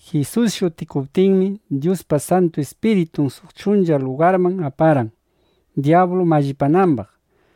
Jisus shutikuptinmi, Dyuspa Santu Ispiritun suq chuncha lugarman aparqan, dyablu mallipanambaq.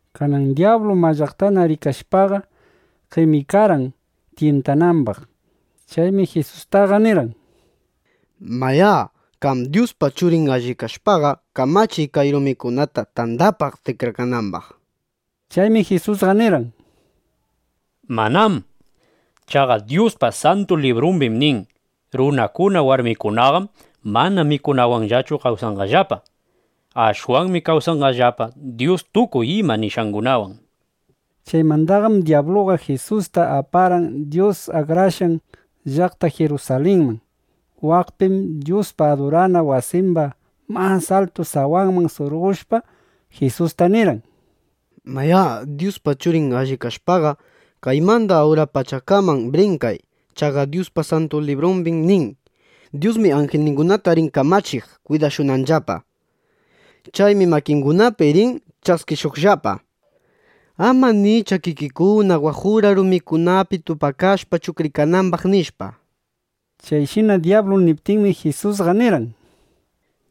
Kanan dyablu mallaqtana rikashpaqa, qemikarqan tyintanambaq. Chaymi Jisustaqa nirqan: —Mayá, qam Dyuspa Churin allip kashpaqa, kamachiy kay rumikunata, tandapaq tikrakanambaq, nishpa. Chaymi Jisusqa nirqan: —¡Manám! Chaqa Dyuspa Santu Librumbim nin: “Runakuna warmikunaqam mana mikunawanllachu kawsanqallapa. Ashwanmi kawsanqallapa Dyus tukuy ima nishqangunawan”, nishpa. Chaymandaqam dyabluqa Jisusta aparqan Dyus akrashqan llaqta Jirusalinman. Waqpim Dyuspa adurana wasimba mas altu sawanman surqoshpa, Jisusta nirqan: —Mayá, Dyuspa Churin allip kashpaqa, kaymanda ura pachakaman brinkay. Chaqa Dyuspa Santu Librumbim nin: Dyusmi anjilningunata rin kamachiq kwidashunanllapa. Chaymi makingunapi rin ch'askishuqllapa, ama ni ch'akikikuna waq ura rumikunapi tupakashpa chuqrikanambaq, nishpa. Chayshina dyablu niptinmi, Jisusqa nirqan: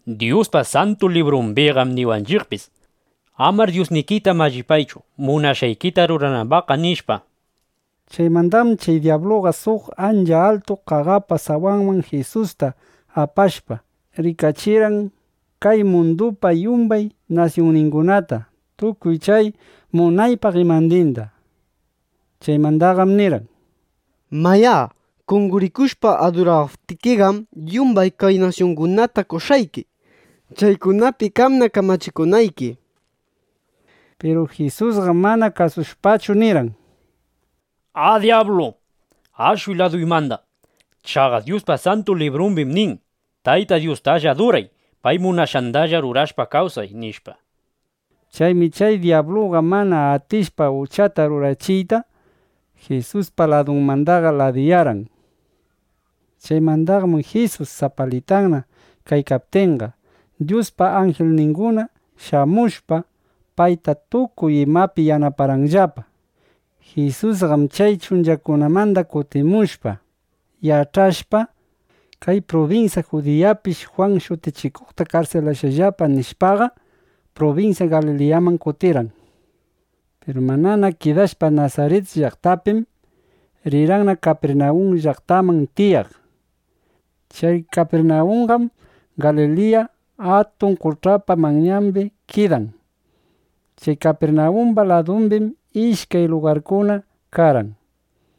—Dyuspa Santu Librumbiqam niwanchiqpis: “Amar Dyusnikita mallipaychu, munashqaykita ruranambaqqa”, nishpa. Chaymandaqam chay dyabluqa suq ancha altu qaqapa sawanman Jisusta apashpa, rikachirqan kay mundupa yumbay nasyunningunata, tukuy chay munaypaq imandinda. Chaymandaqam nirqan: —Mayá, qonqorikushpa adurawaptikiqam, yumbay kay nasyungunata qoshqayki, chaykunapi qamna kamachikunayki, nishpa. Piru Jisusqam mana kasushpachu, nirqan: —¡A dyablu, ashuy laduymanda! Chaqa Dyuspa Santu Librumbim nin: “Tayta Dyustalla aduray. Pay munashqandalla rurashpa kawsay”, nishpa. Chaymi chay dyabluqa, (mana atishpa uchata rurachiyta), Jisuspa ladunmandaqa ladiyarqan. Chaymandaqam Jisus sapalitanna kaykaptinqa, Dyuspa anjilningunana shamushpa, payta tukuy imapi yanaparqanllapa. Jisusqam chay chunchakunamanda kutimushpa, yach'ashpa: Kay prubinsya Judiyapish Jwan Shutichikuqta karsilashqallapa, nishpaqa, prubinsya Galiliyaman kutirqan. Piru manana kidashpa Nasarit llaqtapim, rirqanna Kapirnawun llaqtaman tiyaq. Chay Kapirnawunqam Galiliya Atun Qoch'apa manyambi kidan. Chay Kapirnawumba ladumbim ishkay lugarkuna karqan.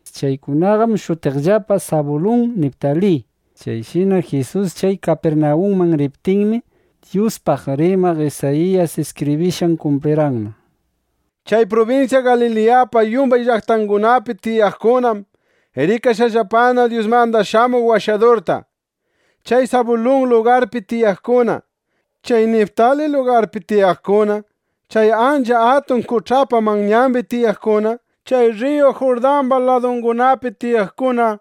Chaykunaqam shutiqllapa Sabulun, Niptali. Chayshina Jisus chay Kapirnawunman riptinmi, Dyuspaq rimaq Isayiyas iskibrishqan kumplirqanna: Chay prubinsya Galiliyapa yumbay llaqtangunapi tiyaqkunam rikashqallapana Dyusmanda shamuq Washadurta. Chay Sabulun lugarpi tiyaqkuna, chay Niptali lugarpi tiyaqkuna, chay ancha atun qoch'apa manyambi tiyaqkuna, chay rriyu Jurdamba ladungunapi tiyaqkuna,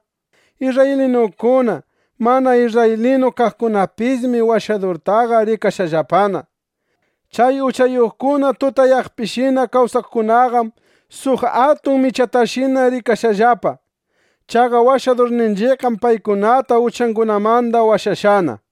isrraylinukuna, mana isrraylinu kaqkunapismi Washadurtaqa rikashqallapana. Chay uchayuqkuna tutayaqpishina kawsaqkunaqam suq atun michatashina rikashqallapa. Chaqa Washadurninchiqqam paykunata uchangunamanda washashqana, nishpa.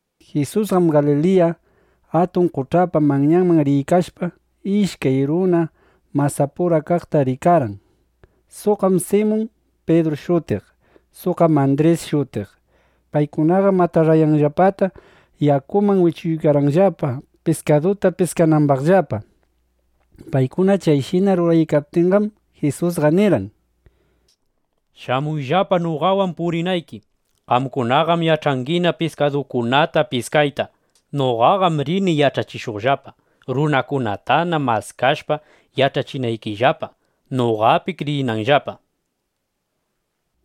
Jisusqam Galiliya Atun Qoch'apa manyanda riykashpa, ishkay runa masapura kaqta rikarqan. Suqqam Simun Pidru shutiq. Suqqam Andris shutiq. Paykunaqam atarrayanllapata yakuman wichuykarqanllapa, piskaduta piskanambaqllapa. Paykuna chayshina ruraykaptinqam, Jisusqa nirqan: —Shamuyllapa noqawan purinayki. Qamkunaqam yach'angina piskadukunata piskayta. Noqaqam rini yach'achishuqllapa, runakunatana maskashpa, yach'achinaykillapa, noqapi kriyinanllapa, nishpa.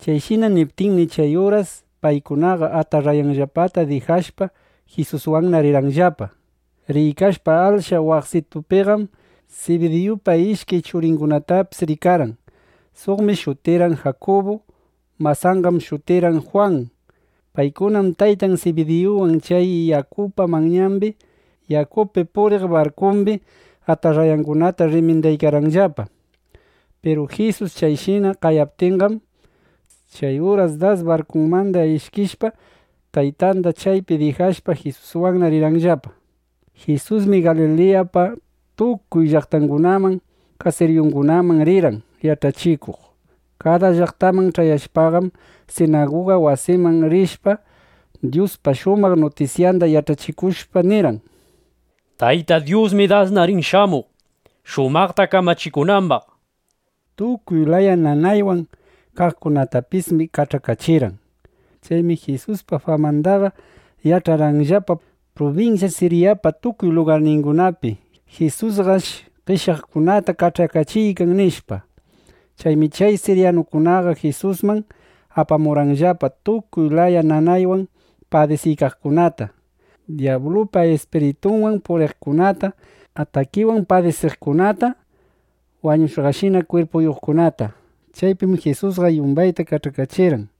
Chayshina niptinmi, chay uras paykunaqa, atarrayanllapata dijashpa, Jisuswanna rirqanllapa. Riykashpa, ashla waqsitupiqam Sibidiyupa ishkay churingunatapis rikarqan. Suqmi shutirqan Jakubu. Masanqam shutirqan Jwan. Paykunam taytan Sibidiyuwan chay yakupa manyambi yakupi puriq barkumbi atarrayangunata rrimindaykarqanllapa. Piru Jisus chayshina qayaptinqam, chay uras das barkunmanda ishkishpa, taytanda chaypi dijashpa, Jisuswanna rirqanllapa. Jisusmi Galiliyapa tukuy llaqtangunaman, kasiriyungunaman rirqan yach'achikuq. Kada llaqtaman ch'ayashpaqam, sinaguga wasiman rishpa, Dyuspa shumaq nutisyanda yach'achikushpa nirqan: —Tayta Dyusmi dasna rin shamuq, shumaqta kamachikunambaq, nishpa. Tukuy laya nanaywan kaqkunatapismi kach'akachirqan. Chaymi Jisuspa famandaqa yach'arqanllapa prubinsya Siryapa tukuy lugarningunapi: Jisusqash qeshyaqkunata kach'akachiykan, nishpa. Chaymi chay siryanukunaqa Jisusman apamurqanllapa tukuy laya nanaywan padisiykaqkunata, dyablupa ispiritunwan puriqkunata, atakiwan padisiqkunata, wañushqashina kwirpuyuqkunata. Chaypim Jisusqa yumbayta kach'akachirqan.